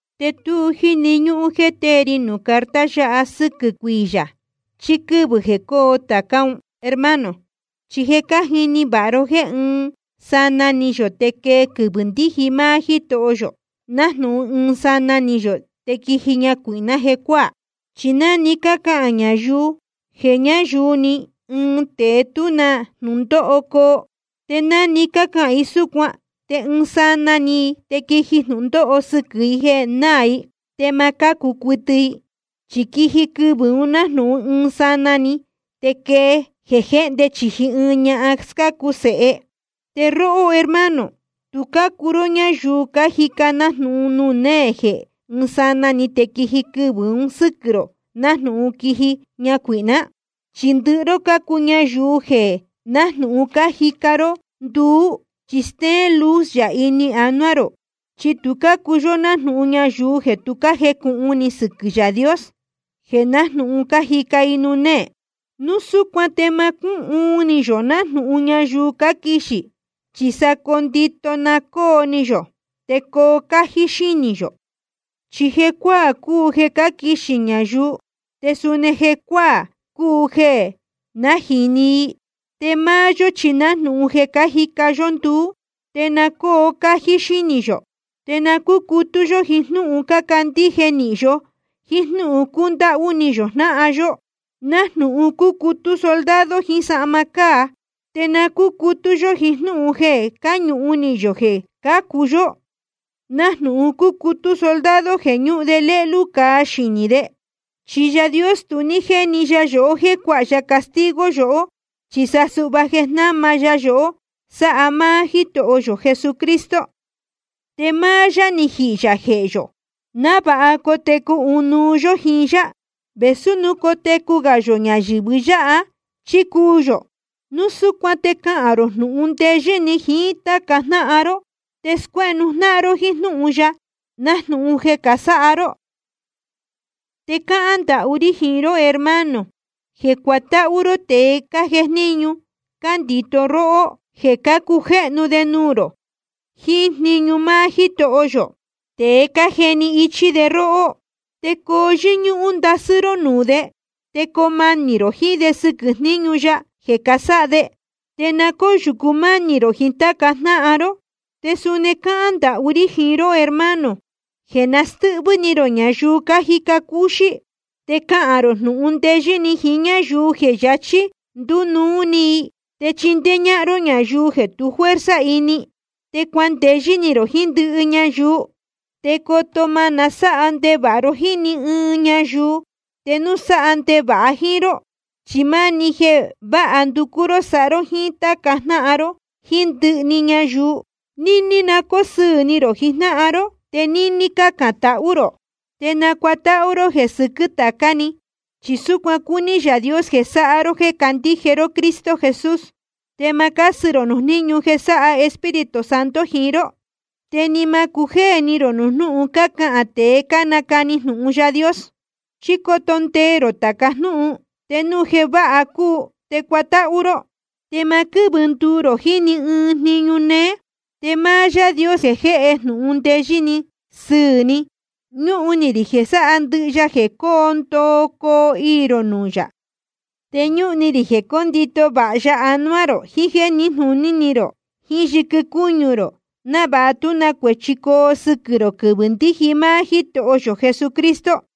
Te tu jíni ñúhún jéē tée ri nuū carta yáha sɨ́quɨ̄ cuiyā chí quɨ́vɨ̄ jeē coo tācá un, hermano. Chi je cájini vāha ró jéē ɨɨn sanaa ni yō te quee quɨvɨ̄ ndíji máá Jítoho yō, nájnūhun ɨɨn sanaa ni yō te quíji ñacuīhná jecuáā. Chi ná‑ni cácahān ñayuu jeē nayúú‑ni íin te tú na jnūndóho coo, te ná‑ni cácahān i súcuan te ɨɨn sanaa ni i te quiji jnūndóho sɨquɨ̄ i jeē náā i, te ma cácu cuɨtɨ i. Chi quiji quɨvɨ̄ un nájnūhun ɨɨn sanaa‑ni te quéjéé jéhndē chīji ɨɨn ñahan scácu sēhe. Te róhó hermano, tu cácuu ró ñáyuu cájica nájnūhun nuū néē jeē ɨ́ɨn sanaa‑ni te quiji quɨvɨ̄ un sɨ́quɨ̄ rō nájnūhun quíji ñacuīhná. Chi ndɨhɨ ró cácuu ñayuu jeē nájnūhun cájica ró nduú, chi stéén luz yā ini anuá rō. Chi tu cácuu yó nájnūhun ñayuu jeē tu jécūhun ni sɨquɨ̄ Yaā Dios, jeē nájnūhun cájica i nuū néē. Núu súcuan te ma cúhuun ni yō nájnūhun ñayuu cáquixī, chi sa ndito na cóo ni yō te coo cájí xínī yō. Chi jecuáā cúu jeē cáquixī ñayuu, te suni jecuáā cúu jeē nájīni i. Te máá yó chi nájnūhun jeē cájica yó nduú, te na cóo cájí xínī yō. Te na cúcutú yó jíín jnúhun cándíje nīhin yó jiín jnúhun cúndáhú ni yō jnáhan yó, nájnūhun cúcutú soldado jiín sahma cáa. Te na cúcutú yó jiín jnúhun jeē cáñuhun ni yō jeē cācu yó, nájnūhun cúcutú soldado jeē ñúhun lélú cāa xinī de. Chi Yaā Dios tu ní jéni ya yohó jéē cuáha ya castigo yohó, chi sa suhva jeē jnama ya yohó sáha máá Jítoho yō Jesucristo. Te máá yá ni jihī yā jehē yō, návāha cotecu ɨnuú yó jíín yá, vēsú núu cotecu gā yō ñayɨ̄vɨ yáha chí cúū yō. Núu súcuan te cahān rō jnūhun ndeyɨ́ ni jiín táca jnáhan ró, te scuéhnu jnáhan ró jíín jnúhun ya, nájnūhun je cásáha ró. Te cácahān ndahú rí jiín ró hermano, jeē cuatáhú ró tēe cájejníñu cándito róhó, jeē cácujéhnu de nuū rō jiín jniñu máá Jítoho yō, te cájeni ichí de róhó. Te coo yɨ́ñúhún ndasɨ́ ró nuū de, te coo manī rō jiín de sɨquɨ̄ jniñu ya jeē casáha de. Te na cóyūcu mánī rō jiín táca jnáhan ró. Te suni cácahān ndahú rí jiín ró hermano, jeē na stɨ́hvɨ́ ni rō ñayuu cájica cúxí. Te cahān rō jnūhun ndeyɨ́ ni jiín ñáyuu jeē yachī ndínuu ni i. Te chindéé ñáhán ró ñayuu jeē tu fuerza ini. Te cuandeyɨ́ ni rō jiín ndɨhɨ ñayuu. Te coto má nasáha ndevāha ro jíín ni ɨɨn ñayuu te núu sáha ndevāha i jíín ró. Chi máni jeē váha nducú ró sáha ró jíín táca jnáhan ró jíín ndɨhɨ‑ni ñayuu. Níní na cóo sɨɨ̄ ni rō jijnáhan ró. Te níní na cácán tahú rō. Te nacuatáhú ró jeē sɨquɨ́ tācá‑ni. Chi súcuan cúní Yaā Dios jeē sáha ró jéē cácandíje ró Cristo Jesús. Te ma cásɨ rō nuū jníñu jeē sáha Espíritu Santo jiín ró. Te ni ma cujéē ni rō nuū jnúhun cácahān tēe cánacani jnūhun Yaā Dios. Chi coto ndee rō tāca jnúhun, te núu jeē váha cúu, te cuatáhú ró. Te ma quɨ́vɨ nduu rō jiín ni ɨɨn jniñu néé. Te máá Yaā Dios jeē jéhe jnūhun ndeyɨ́ sɨ́ɨ̄ ni, ñúhun ni rī jeē sáha ndɨhɨ ya jeē cóo ndoo coo iī rō nuū yā. Te ñúhun ni rī jeē cóndito vāha ya anuá rō jiín jéē níjnūní rō, jíín yɨquɨ cúñu rō, návāha tú na cuēchi coo sɨquɨ̄ rō quɨvɨ̄ ndíji máá Jítoho yō Jesucristo.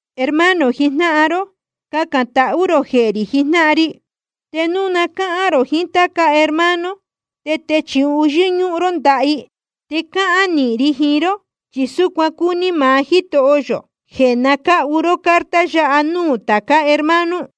Hermano jijnáhan ró, cacān tahú rō jehē rī jijnáhan ri. Te núu na cáhán rō jiín táca hermano, te techūhu yɨ́ñúhún ró ndaha i. Te cáhán nīhin ri jiín ró, chi súcuan cúní maá Jítoho yō, jeē na cáhu ró carta yáha núū tācá hermano.